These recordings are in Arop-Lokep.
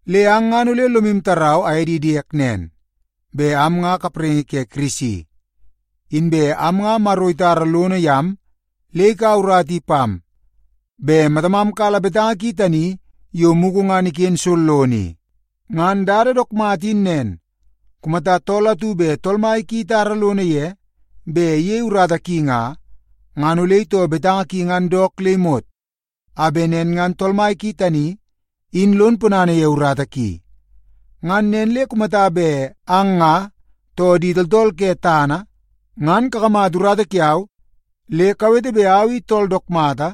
Le ang ngan ole lomu tarau aye di diek nen, bet am nga kapraingi ke Kirisi. Inbe am nga Maro itara lono yam le ikaua urata i pam bet matamam kala betanga ki tani yo mugu ngan iken sollono i. Ngan dada dook mata in nen, kumata tool atu bet tool mai ki itara lono ye bet iyei urata ki nga, ngan ole itoo betanga ki ngan dook le imot, a bet nen ngan tool mai ki tani in lon ponana ye urata ki. Ngan nen le kumata bet ang, too di tooltool ke tana i, ngan kakamata urata kiau le kawete bet au i tool dook mata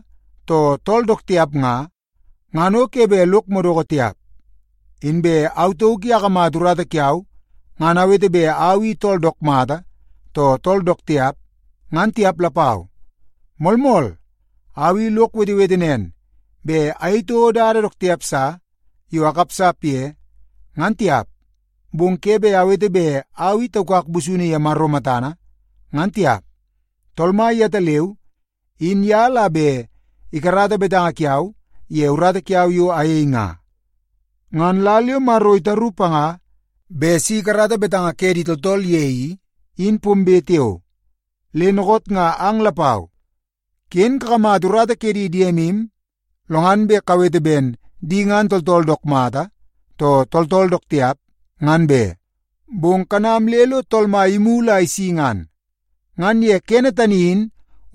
too tool dook tiap nga, ngan o ke bet lok madoko tiap. Inbe au tauk i akamata urata kiau ngan awete ben au i tool dook mata, too tool dook tiap, ngan tiap lapau. Moolmool, au i lok wetewete nen bet ayei toko dada dook tiap sa yo akapsap ye, ngan tiap. Bong ke bet awete bet au i taukak busunu ye Maro matana ngan tiap. Tool Mai yetaleu in ye la bet ikarata betanga kiau ye urata kiau yo ayei nga. Ngan lal yo Maro itaru panga bet si ikarata betanga ke di tooltool ye i, in pombe tiao. Le dookoot nga ang lapau ken kakamata urata ke di diemu lo ngan bet kawete ben di ngan tooltool dook mata, too tooltool dook tiap, ngan be. Bong kanam le lo Tool Mai imulu a isi ngan. Ngan ye kene tani in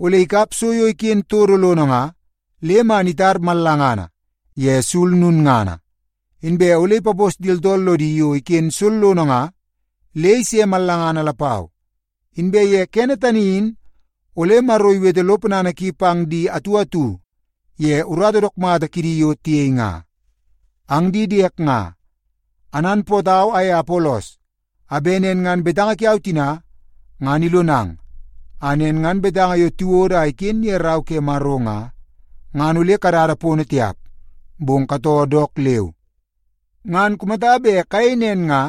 ole ikap so yo iken todo lono nga le man itar mallangana ye sul lulngana. Inbe ole ipapos di tooltool lodi yo iken sollono nga le ise mallangana lapau. Inbe ye kene tani in ole Maro iwete lo ponana ki pang di atu atu ye urata dook mata kidi yo tiyei nga. Ang di diek nga, ananpootau aye Apolos a bet nen ngan betanga kiau tina ngan ilonang, a nen ngan betanga yo tiwodo a iken ye Rau ke Maro nga, ngan ole kadada pono tiap, bong katoo dook leu. Ngan kumata bet kayei nen nga,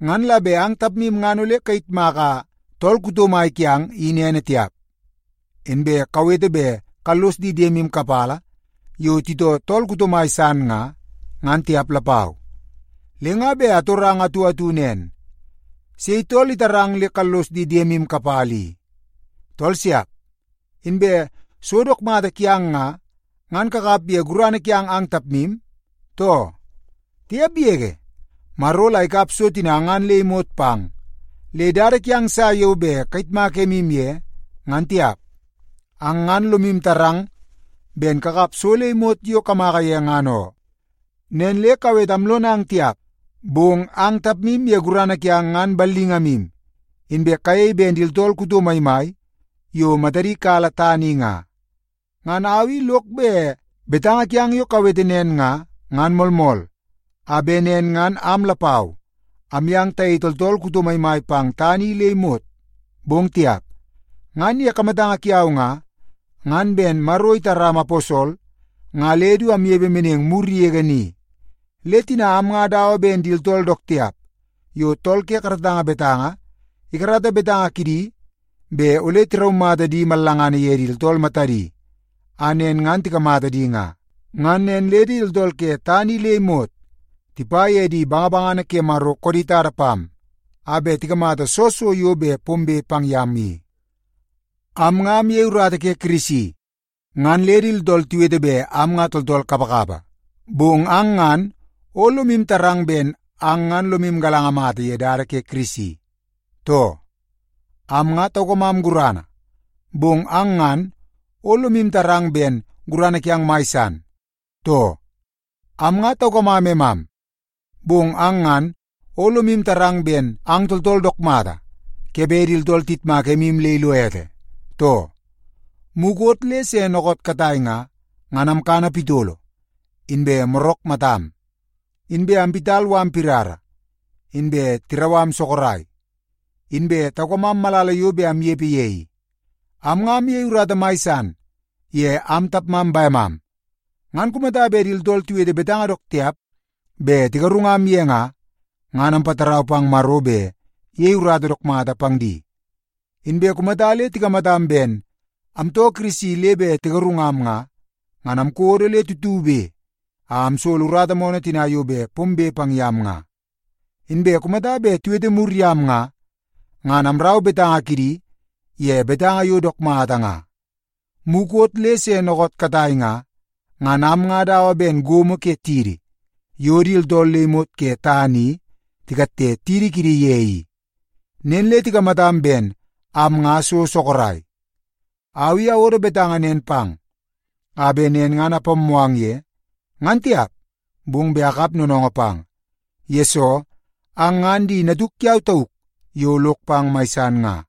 ngan la bet ang tapmu ngan ole kayitmaka tool kuto mai kiang in ene tiap, inbe kawete bet kallos di diemu kapala yo titoo tool kuto mai san nga, ngan tiap lapau. Le nga bet atorang atu atu nen: Sei tool itarang le kallos di diemu kapala i? Tool siap! Inbe so dook mata kiang nga, ngan kakap ye gurana kiang ang tapmu, too? Tiap yege! Maro la ikap so tina ngan le imot pang, le dada kiang sa yo bet kayitmak emu ye, ngan tiap. Ang ngan lomu tarang ben kakap so le imot yo kamaka ye ngan oo. Nen le kawete amlonang tiap, bong ang tapmu ye gurana kiang ngan ballingamu, inbe kayei ben di tooltool kuto maimai yo matadi kala tana i nga. Ngan au i lok bet betanga kiang yo kawete nen nga, ngan moolmool, a bet nen ngan am lapau amyang tayei tooltool kuto maimai pang tana i le imot, bong tiap. Ngan ye kamatanga kiau nga, ngan ben Maro itaram aposol nga le du amnepe meneng mur yege ni. Le tina am nga dawa ben di tooltool dook tiap yo tool ke karatanga betanga ikarata betanga kidi bet ole tiraumata di mallangana ye di tooltool matadi a nen ngan tikamata di nga. Ngan nen le di tooltool ke tana i le imot tipa ye di bangabangana ke Maro koodi tada pam a bet tikamata soo so yo bet pombe pang yam i. Am nga amyei urata ke Kirisi ngan le di tooltool tiwete bet am tooltool kapakapa. Bong ang ngan o lomu tarang ben ang ngan lomu galanga mata ye dada ke Kirisi, too? Am nga taukamam gurana, bong ang ngan o lomu tarang ben gurana kiang mai san, too? Am nga taukamam emam, bong ang ngan o lomu tarang ben ang tooltool dook mata ke bet di tooltool tiyitmak emu le ilo ete, too? Mukot le se dookoot katai nga, ngan amkana pitolo inbe morak matam. Inbe amwit mala pirara, inbe tirau am sorok, inbe taukamam malala yo bet amnepe ye i. Am nga amyei urata mai san ye am tapmam bemam. Ngan kumata bet di tooltool tiwete betanga dook tiap bet tigarungam ye nga, ngan ampatarau pang Maro bet iyei urata dook mata pang di. Inbe kumata le tikamatam ben amtoo Kirisi le bet tigarungam nga, ngan amkodo le tutube a amsolo urata moonoo tina yo bet pombe pang yam nga. Inbe kumata bet tiwete mur yam nga, ngan amrau betanga kidi ye betanga yo dook mata nga. Mukot le se dookoot katai nga, ngan am nga dawa ben gomo ke tidi yo di tooltool le imot ke tana i tikatte tidi kidi ye i. Nen le tikamatam ben am nga so sorok. Au i awodo betanga nen pang a bet nen ngan apammoo ang ye, ngan tiap, bong bet akap noonoongoo pang, yesoo ang ngan di natuk kiau tauk yo lok pang mai san nga.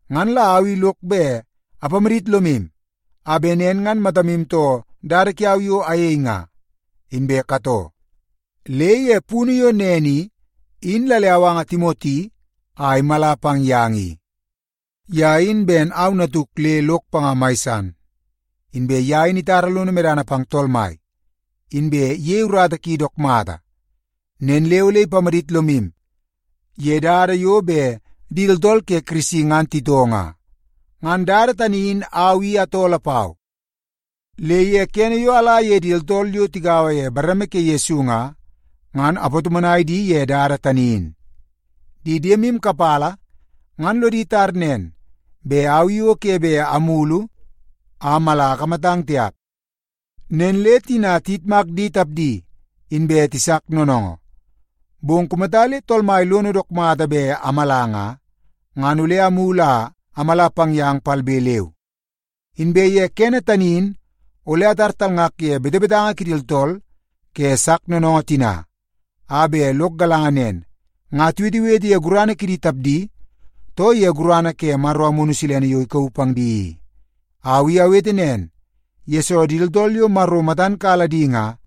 Ngan la au i lok bet apamadit lomu a bet nen ngan matamu too dada kiau yo ayei nga, inbe katoo. Le ye punu yo nen i, in la le awanga Timoti a imala pang yang ye i. Ye in ben au natuk le lok panga mai san. Inbe ye in itara lono medana pang Tool Mai, inbe iyei urata ki dook mata. Nen le ole ipamadit lomu ye dada yo bet di tooltool ke Kirisi ngan titoo nga. Ngan dada tani in au i atoo lapau, le ye kene yo ala ye di tooltool yo tigaua ye bareme ke Yesu nga, ngan apatomonai di ye dada tani in. Di diemu kapala ngan lodi tar nen, bet au i o ke bet amulu a amala akamatang tiap. Nen le tina tiyitmak di tapdi, inbe tisak noonoongoo. Bong kumata le Tool Mai lono dook mata bet amala nga, ngan ole amulu a amala pang yang palbe leu. Inbe ye kene tani in ole atar talngak ye betebetanga kidi tooltool ke sak noonoongoo tina a bet lok galanga nen, nga tiwetewete ye gurana kidi tapdi, too ye gurana ke Maro Amunu Silene yo ikauu pang di i. Au i awete nen, yesoo di tooltool yo Maro matan kala di nga,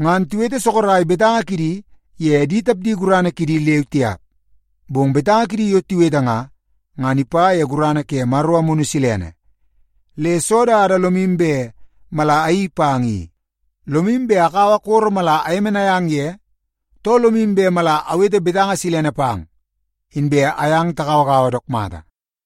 ngan tiwete sorok betanga kidi ye di tapdi gurana kidi leu tiap. Bong betanga kidi yo tiwete nga, ngan ipa ye gurana ke Maro Amunu Silene. Le soo dada lomu bet mala ayeii pang i? Lomu bet akaua koro mala ayemenai ang ye, too lomu bet mala awete betanga silene pang inbe ayang tagauagaua dook mata?